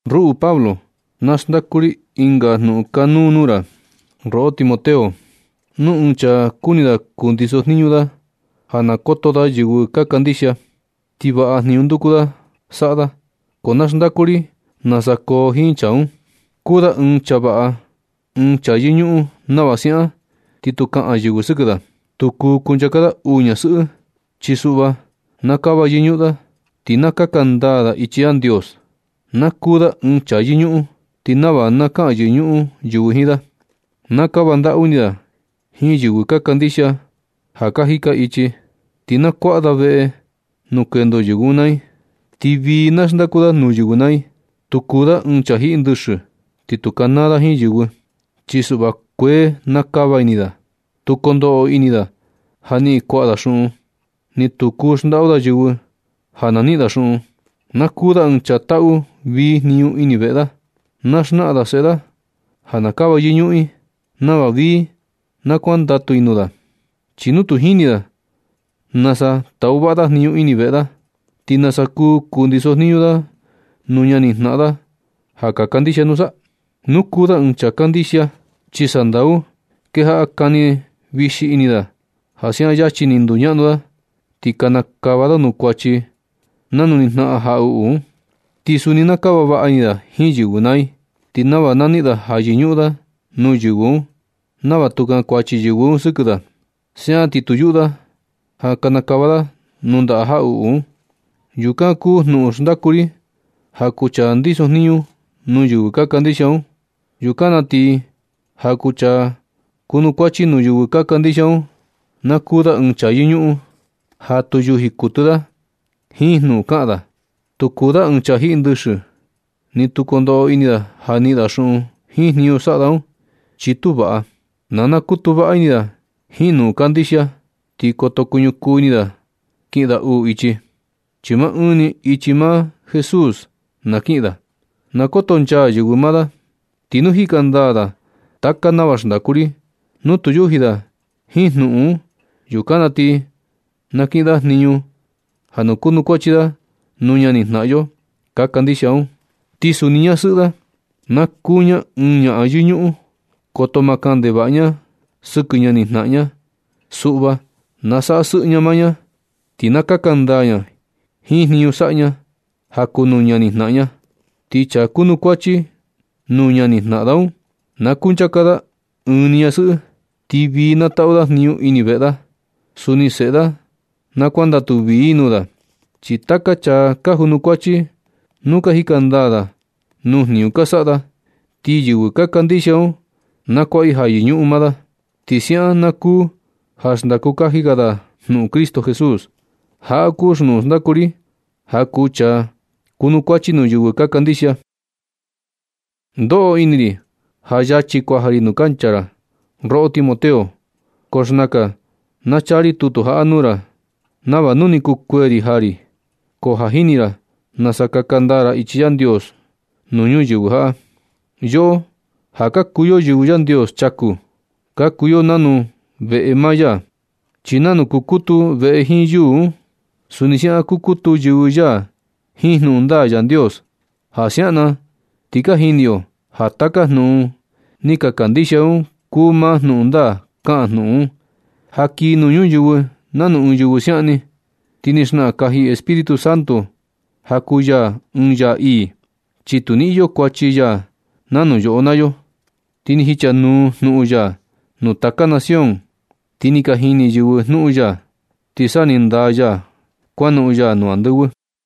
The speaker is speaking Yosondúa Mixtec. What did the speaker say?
Ruꞌu Pablo, na xndaku ri ɨnga jnuꞌun kanuu nuu ra, roꞌo Timoteo. Nu ɨɨn chaa kuni da kundiso jniñu da ja na koto da yɨvɨ ka kandixia, ti vaꞌa jniñu nduku da saꞌa da. Ko na xndaku ri nasa koo jiin chaa un. Kuu da ɨɨn chaa vaꞌa, ɨɨn chaa yɨñuꞌun nava siaꞌan, ti tu kaꞌan yɨvɨ sɨkɨ da. Tu kuu kunchaka da uu ñasɨꞌɨ. Chi suꞌva na kava yɨñuꞌun da, ti na kaka ndaa da ichi Yandios. Na kuu da ɨɨn chaa yɨñuꞌun ti nava na kaꞌan yɨñuꞌun yɨvɨ jiin da. Na kava ndaꞌu ini da jiin yɨvɨ ka kandixia ja ka jika ichi, ti na kuaꞌa da veꞌe nuu kendo yɨvɨ un naa i. Ti vii na xndaku da nuu yɨvɨ naa i. Tu kuu da ɨɨn chaa jiꞌi ndɨxɨ, ni tu kanaa da jiin yɨvɨ. Chi suꞌva, kuee na kava ini da. Tu kondoꞌo ini da ja niꞌin kuaꞌa da xuꞌun, ni tu kuu xndaꞌu da yɨvɨ ja na niꞌin da xuꞌun. Na kuu da ɨɨn chaa taꞌu vii jniñu ini veꞌe da. Na xnaꞌan da seꞌe da ja na kava yɨñuꞌun i, nava vii na kuandatu i nuu da. Chi nu tu jini da nasa taꞌu vaꞌa da jniñu ini veꞌe da, ¿ti nasa kuu kundiso jniñu da nuu ñani jnaꞌan da ka kandixia nusa? Tu kuu da ɨɨn chaa skan kandixia, chi sandau kejaꞌa kani vixi ini da ja siaꞌan yachi ni nduñaꞌnu da, ti kanakava da nuu kuachi nanu ni jnaꞌan jaꞌuꞌu un. Ti suni na kava vaꞌa ini da jiin yɨvɨ naa i, ti nava na niꞌin da ja yɨñuꞌun da nuu yɨvɨ un, nava tu kankuachi yɨvɨ un sɨkɨ da. Siaꞌan ti tu yuꞌu da ja kanakava da nuu ndaꞌa jaꞌuꞌu un. Yukan kuu jnuꞌun xndaku ri ja kuu chaa kundiso jniñu nuu yɨvɨ ka kandixia un. Yukan na ti ja kuu chaa kuanukuachi nuu yɨvɨ ka kandixia un, na kuu da ɨɨn chaa yɨñuꞌun, ja tu yuji kuɨtɨ da jiin jnuꞌun kaꞌan da. Tu kuu da ɨɨn chaa jiꞌi ndɨxɨ, ni tu kondoꞌo ini da ja niꞌin da xuꞌun jiin jniñu saꞌa da un, chi tu vaꞌa. Na nakutu vaꞌa ini da jiin jnuꞌun kandixia. Ti koto kuñukuu ini da kiꞌin da uu ichi, chi maa ɨɨn ni ichi maa Jesús na kiꞌin da. Na kotonchaa yɨvɨ maa da. Ti nu jika ndaa da taka nava xndaku ri, nu tu yuji da jiin jnuꞌun un, yukan na ti na kiꞌin da jniñu ja na kunukuachi da nuu ñani jnaꞌan yo ka kandixia un. Ti suni ñasɨꞌɨ da, na kuu ña ɨɨn ñaꞌan yɨñuꞌun. Koto ma kaꞌan ndevaꞌa ña sɨkɨ ñani janaꞌan ña. Suꞌva na saꞌa sɨꞌɨ ña maa ña, ti na kaka ndaa ña jiin jniñu saꞌa ña ja kuu nuu ñani jnaꞌan ña. Ti chaa kunukuachi nuu ñani jnaꞌan da un, na kunchaka da ɨɨn ni ñasɨꞌɨ. Ti vii na taꞌu da jniñu ini veꞌe da. Suni seꞌe da na kuandatu vii i nuu da. Chi taka chaa ka junukuachi, nu ka jika ndaa da nuu jniñu ka saꞌa da, ti yɨvɨ ka kandixia un na kuaꞌa i ja yɨñuꞌun maa da. Ti siaꞌan na kuu ja xndaku kaji ga da jnuꞌun Cristo Jesús. Jaꞌa kuu jnuꞌun xndaku ri ja kuu chaa kunukuachi nuu yɨvɨ ka kandixia. Ndoꞌo ini ri ja yachi ni kuaja ri nuu kancha ra, roꞌo Timoteo, ko xnakan na chaa ri tutu jaꞌa nuu ra, nava nu ni kukuee ri jaa ri, ko ja jini ra nasa kaka ndaa ra ichi Yandios nuu ñuyɨvɨ jaꞌa. Yoꞌo ja ka kuu yo yɨvɨ Yandios chaku, ka kuu yo nanu veꞌe maa ya. Chi nanu kukutu veꞌe jiin yuu un, suni siaꞌan kukutu yɨvɨ ya jiin jnuꞌun ndaa Yandios. Ja siaꞌan na ti ni ka jini yo ja taka jnuꞌun ni ka kandixia yo un kuu maa jnuꞌun ndaa. Kaꞌan jnuꞌun un: Ja kii nuu ñuyɨvɨ nanu ɨɨn yɨvɨ siaꞌan ni. Ti ni xnaꞌan kaji Espíritu Santo ja kuu ya ɨɨn Yaa ii, chi tu ni iyo kuachi ya nanu yoꞌo naa yo. Ti ni jichanuu jnuꞌun ya nuu taka nación, ti ni ka jini yɨvɨ jnuꞌun ya, ti sa ni ndaa ya kuanoꞌon ya nuu andɨvɨ.